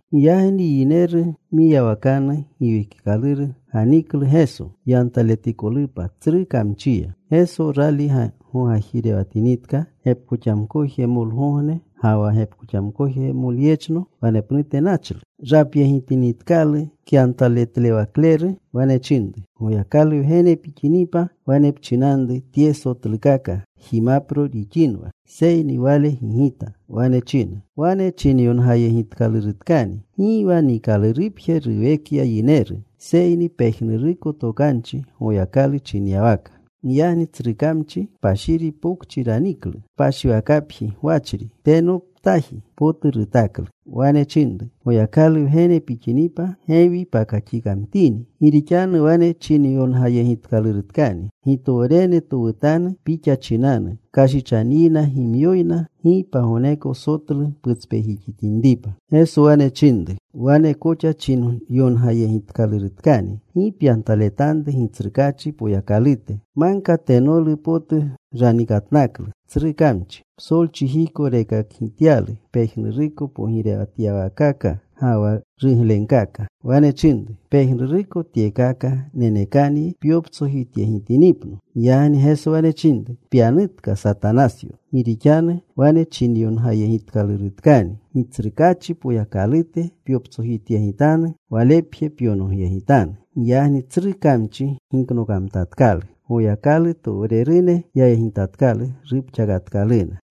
Giyagni yineru mwiyawakanu Giwekikaluru ganiklu Geso, yantaletikolupa tsru kamchiya. Geso, rali gogajirewatinitka gepkoxamkojmolegogne ga wa gepkoxamkojmoleyechno, wanepnute nachlu. Rapyegitinitkalu kyantaletlewakleru, wane chinru, “Goyakalu Wgene pixinipa, wane pchinanru tye sotlukaka jimapro rixinwa.” Seyni Wale gigita. Wane china, “Wane chinayongayegitkalurutkani: Gi wa niikalurupje ruwekya yineru, Seyni pejnuruko tokanchi Goyakalu chinyawaka.” Giyagni tsru kamchi kpashiri pokchi raniklu. Kpashiwakapji gwachri tenoptaji potu rutaklu. Wane chinru, “Goyakalu Wgene pixinipa, gewi pakaxikamtini. Gi rixanu wane chinayongayegitkalurutkani: Gitowrene towutanu Pixa chinanu. Kashichanyina gimyoyna, gi pagogneko sotlu putspejixitinripa.” Geso wane chinru, “Wanekoxa chinyongayegitkalurutkani: Gi pyantaletanru Gitsrukaachi Poyakalute.” Magka tenolu potu ranikatnaklu tsru kamchi. Psolchijiko rekakgityalu pejnuruko pogirewatyawaakaka ga wa ruglenkaka. Wane chinru, “Pejnuruko tyekaka nenekanyi pyoptsojityegitinipno.” Giyagni Geso wane chinru, “Pyanutka, Satanasyo. Gi rixanu wane chinayongayegitkalurutkani: Gitsrukaachi Poyakalute pyoptsojityegitanu. Walepje pyonogyegitanu.” Giyagni tsru kamchi giknokamtatkalu. Goyakalutowrerune yayegitatkalu. Rupxakatkaluna.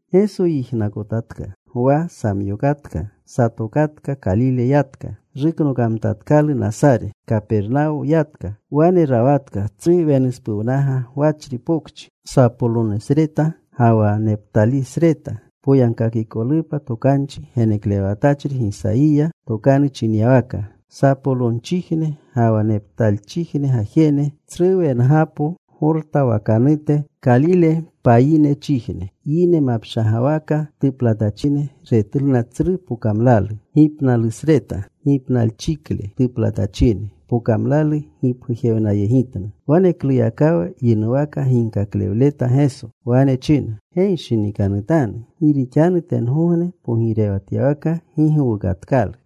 Geso yijnakotatka Gwa samyookatka. Satokatka. Kalile yatka. Ruknokamtatkalu Nasare. Kapernawo yatka. Wane rawatka, tsru wenuspuwnaga gwachri pokchi, Sapolonosreta ga wa Neptalisreta, poyagkakikolupa tokanchi geneklewatachri Gisayiya tokanu chinyawaka: Sapolonchijne ga wa Neptalchijne gajene, tsru wengapo, Gorta wakanute, Kalile payinchijne, Yine mapshagawaka tuplatachine Retluna tsru pokamlalu. Gipnalusreta, gipnalchikle tuplatachine pokamlalu gipgujewnayegitna. Wanekluyakawa yinuwaka ginkaklewleta Geso. Wane china, “Genshinikanutanu, gi rixanu tengogne pogirewatyawaka gi gowukatkalu.”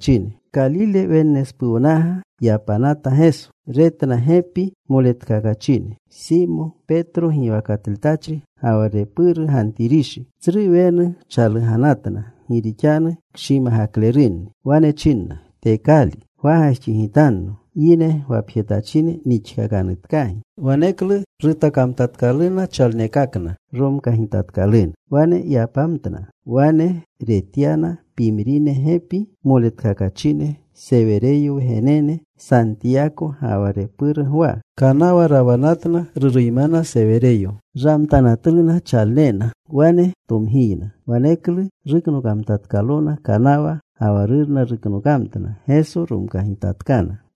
Kalile Wennespuwnaga yapanata Geso. Retna gepi moletkakachine: Simo, Petro giwakatletachri, ga wa repuru Gantirishi. Tsru wenu chaluganatna gi rixanu kshimagaklerunni. Wane chinna, “Tekali. Gwagajxigitanno. Yine gwapjetachine nixkakanutkagi.” Waneklu rutakamtatkaluna chalnekakna. Romkagitatkaluna. Wane yapamtna. Wane retyana pimrine gepi moletkakachine, Sewereyo wgenene: Santiyako ga wa repuru Gwa. Kanawa rawanatna, ruruymana Sewereyo. Ramtanatluna chalnena. Wane tomgiyna. Waneklu ruknokamtatkalona kanawa. Ga wa rurna ruknokamtna. Geso romkagitatkana.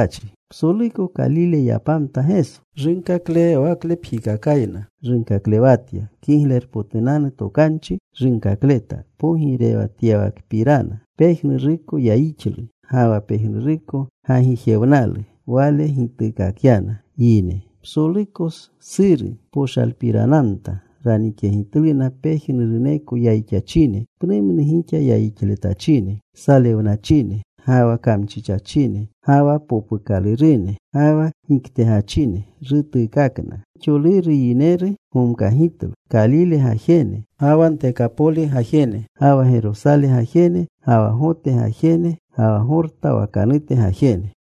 Psoluko Kalile yapamta Geso. Runkaklewawaklepjikakayna runkaklewatya. Kiglerpotunanu Tokanchi runkakleta pogirewatyawakapirana. Pejnuruko yayixlu ga wa pejnuruko gagijewnalu Wale gituukakyana yine. Psoluko Suri poshalpiranamta. Ranikyegitluna pejnuruneko yayixachine, pnumnu gixa yayixletachine, salewnachine, ga wa kamchichachine, ga wa popukalerune, ga wa giktegachine. Rutuukakna. Gixoluru yineru gomkagitlu, Kalile gajene, ga wa Ntekapoli gajene, ga wa Gerosale gajene, ga wa Gota gajene, ga wa Gorta wakanute gajene.